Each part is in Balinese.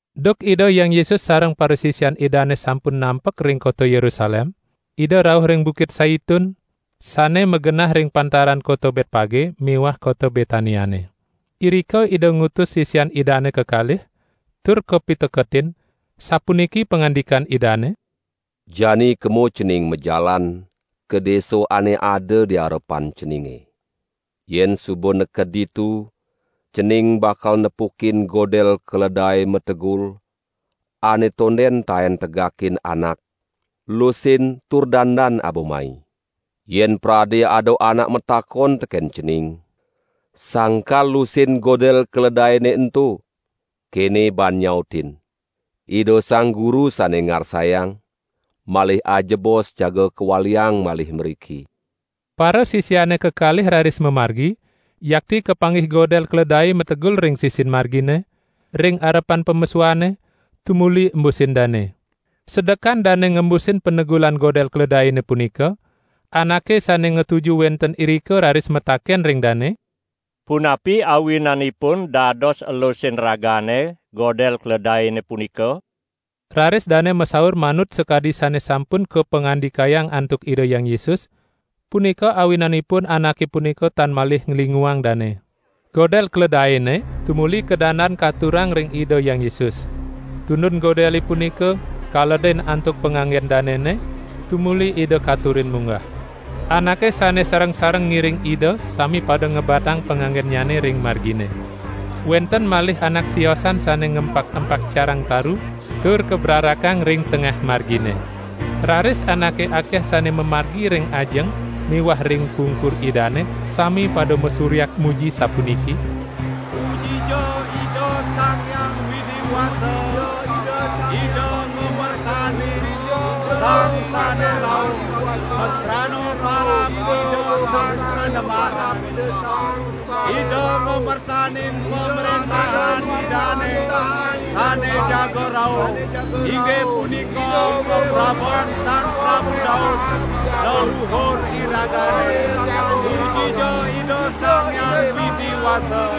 Duk Ida Hyang Yesus sareng parasisian Idane sampun nampek ring kota Yerusalem, Ida rauh ring Bukit Saitun, sane magenah ring pantaran kota Betpage miwah kota Betaniane. Irika Ida ngutus sisian Idane kekalih, tur kapiteketin, sapuniki pangandikan Idane: "Jani kema cening majalan ka desa ane ada di arepan ceninge. Yen suba neked ditu, cening bakal nepukin godel keledae mategul, ane tonden taen tegakin anak, lusin tur dandan aba mai. Yen prade ada anak matakon teken cening: 'Sangkal lusin godel keledaene ento?' Kene baan nyautin: 'Ida Sang Guru sane ngarsayang, malih ajebos jaga kawaliang malih mriki.' " Parasisiane kekalih raris mamargi, yakti kapanggih godel keledae mategul ring sisin margine, ring arepan pamesuane, tumuli embusin dane. Sedekan dane ngembusin panegulan godel keledaene punika, anake sane ngatuju wenten irika raris mataken ring dane: "Punapi awinanipun dados elusin ragane godel keledaene punika?" Raris dane masaur manut sakadi sane sampun kapangandikayang antuk Ida Hyang Yesus, punika awinanipun anake punika tan malih nglinguang dane. Godel keledaene tumuli kadandan katurang ring Ida Hyang Yesus. Tundun godele punika kaledin antuk panganggen danene, tumuli Ida katurin munggah. Anake sane sareng-sareng ngiring Ida sami pada ngebatang panganggennyane ring margine. Wenten malih anak siosan sane ngempak-empak carang taru tur kabrarakang ring tengah margine. Raris anake akeh sane mamargi ring ajeng miwah ring pungkur Idane sami pada masuryak muji sapuniki: "Pujija Ida Sang Hyang Widi Wasa. Ida ngamertanin Sang sane rauh masrana parab Ida Sang Panembahan. Ida ngamertanin Pamrentahan Idane sane jaga rauh, inggih punika kaprabon Sang Prabu Daud leluur iragane. Pujija Ida Sang Hyang Widi Wasa!"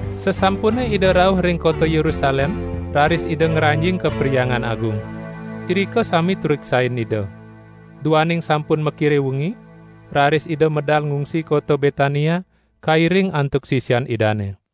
Sasampune Ida rauh ring kota Yerusalem raris Ida ngranjing ka Perhyangan Agung. Irika sami tureksain Ida. Duaning sampun makire wengi, raris Ida medal ngungsi kota Betania kairing antuk sisian Idane.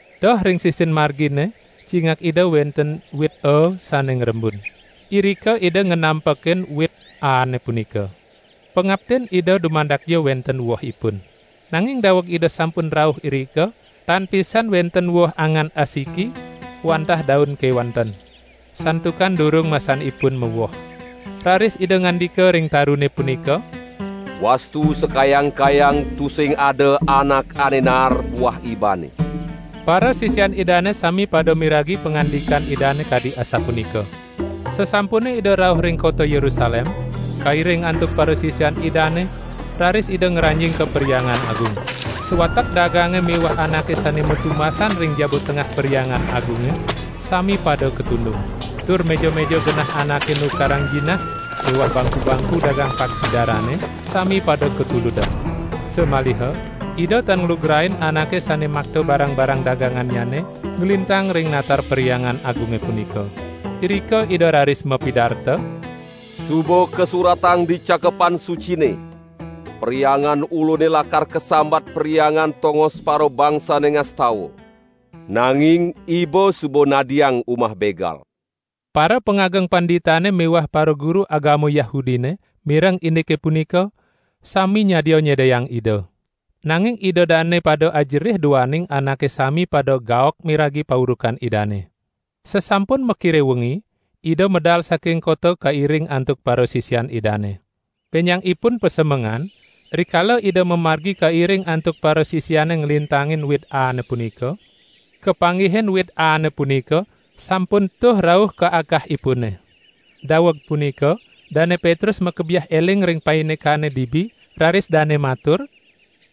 Doh ring sisin margine cingak Ida wenten wit aa sane ngrembun. Irika Ida nganampekin wit aane punika. Pangaptin Ida dumadakja wenten wohipun. Nanging daweg Ida sampun rauh irika tan pisan wenten woh angan asiki, wantah daun kewanten. Santukan durung masanipun mawoh. Raris Ida ngandika ring tarune punika: "Wastu sakayang-kayang tusing ada anak ane naar buah ibane." Parasisian Idane sami pada miragi pangandikan Idane kadi asapunika. Sasampune Ida rauh ring kota Yerusalem, kairing antuk parasisian Idane raris Ida ngranjing ka Perhyangan Agung. Sawatek dagange miwah anake sane matetumbasan ring jaba tengah Perhyangan Agunge sami pada katundung. Tur meja-meja genah anake nukarang jinah miwah bangku-bangku dagang paksi darane sami pada katuludang. Samaliha Ida tan nglugrain anake sane makta barang-barang dagangannyane nglintang ring natar Perhyangan Agunge punika. Irika Ida raris mapidarta: "Suba kasuratang di Cakepan Sucine: 'Perhyangan Ulune lakar kasambat Perhyangan tongos parabangsane ngastawa,' nanging iba suba nadiang umah begal!" Parapangageng panditane miwah paraguru agama Yahudine mireng indike punika, sami nyadia nyedayang Ida. Nanging ida dane pada ajerih duaning anake sami pada gaok miragi paurukan Idane. Sasampun makire wengi, Ida medal saking kota kairing antuk parasisian Idane. Benjangipun pasemengan, rikala Ida mamargi kairing antuk parasisiane nglintangin wit aane punika, kapanggihin wit aane punika sampun tuh rauh ka akahipune. Daweg punika Dane Petrus makebiah eling ring paindikane dibi, raris dane matur: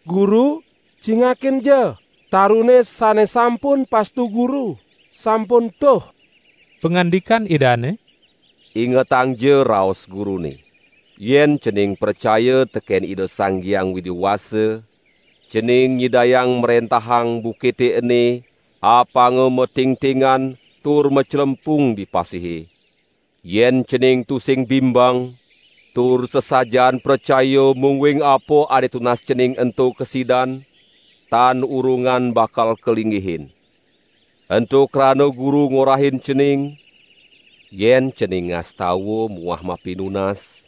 "Guru cingakinja! Tarune sane sampun pastu Guru, sampun tuh." Pangandikan Idane: "Ingetangja raos Gurune! Yen cening pracaya teken Ida Sang Hyang Widi Wasa, cening nyidayang mrentahang bukite ene apanga matingtingan tur maclempung di pasihe. Yen cening tusing bimbang, tur sasajaan pracaya mungguing apa ane tunas cening ento kasidan, tan urungan bakal kalinggihin. Ento krana Guru ngorahin cening: Yen cening ngastawa muah mapinunas,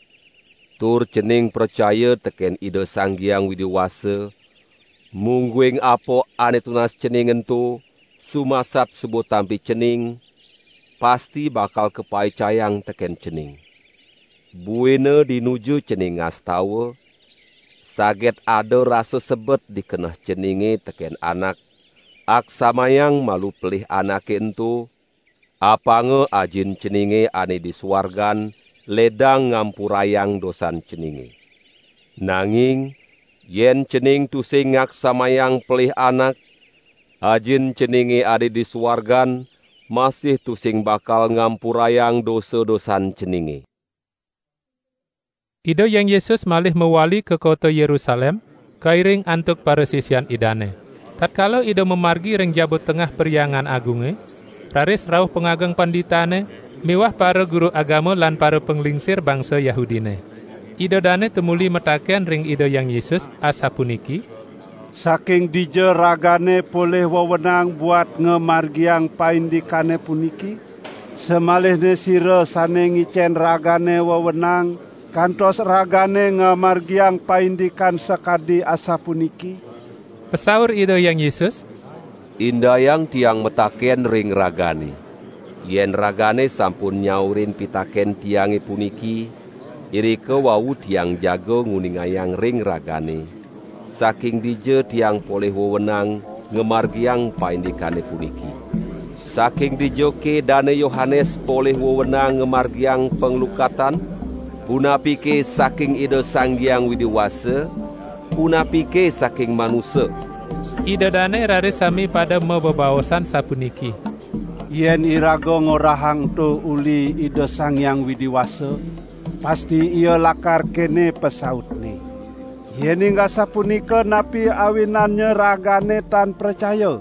tur cening pracaya teken Ida Sang Hyang Widi Wasa, mungguing apa ane tunas cening ento sumasat suba tampi cening, pasti bakal kapaicayang teken cening. Buina dinuju cening ngastawa, saget ada rasa sebet di keneh ceninge teken anak, aksamayang malu pelih anake ento, apanga Ajin ceninge ane di suargan ledang ngampurayang dosan ceninge. [ Nanging yen cening tusing ngaksamayang pelih anak, Ajin ceninge ane di suargan masih tusing bakal ngampurayang dosa-dosan ceninge.]" Ida Hyang Yesus malih mawali ka kota Yerusalem kairing antuk parasisian Idane. Tatkala Ida mamargi ring jaba tengah Perhyangan Agunge, raris rauh pangageng panditane miwah paraguru agama lan parapanglingsir bangsa Yahudine. Ida dane tumuli mataken ring Ida Hyang Yesus, asapuniki: "Saking dija Ragane polih wewenang buat ngamargiang paindikane puniki? Samalihne sira sane ngicen Ragane wewenang kantos Ragane ngamargiang paindikan sakadi asapuniki?" Pasaur Ida Hyang Yesus: "Indayang Tiang mataken ring ragane. Yen ragane sampun nyaurin pitaken Tiange puniki, irika wau Tiang jaga nguningayang ring ragane saking dija Tiang polih wewenang ngamargiang paindikane puniki. Saking dijake Dane Yohanes polih wewenang ngamargiang panglukatan? Punapike saking Ida Sang Hyang Widi Wasa, punapike saking manusa?" Ida dane raris sami pada mabebaosan sapuniki: "Yen iraga ngorahang ento uli Ida Sang Hyang Widi Wasa, pasti Ia lakar kene pasautne: Yening asapunika napi awinannya ragane tan pracaya?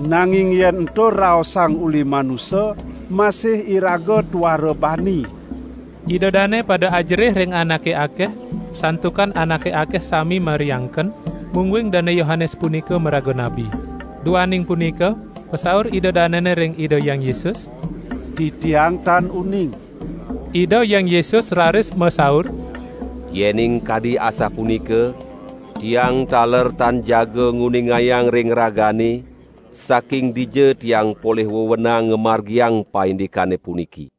Nanging yen ento raosang uli manusa masih iraga tuara bani!" (Ida dane pada ajerih ring anake akeh, santukan anake akeh sami mariangken, mungguing Dane Yohanes punika maraga nabi.) Duaning punika pasaur ida danene ring Ida Hyang Yesus: "Titiang tan uning." Ida Hyang Yesus raris masaur: "Yening kadi asapunika, Tiang taler tan jaga nguningayang ring ragane, saking dija Tiang polih wewenang ngamargiang paindikane puniki."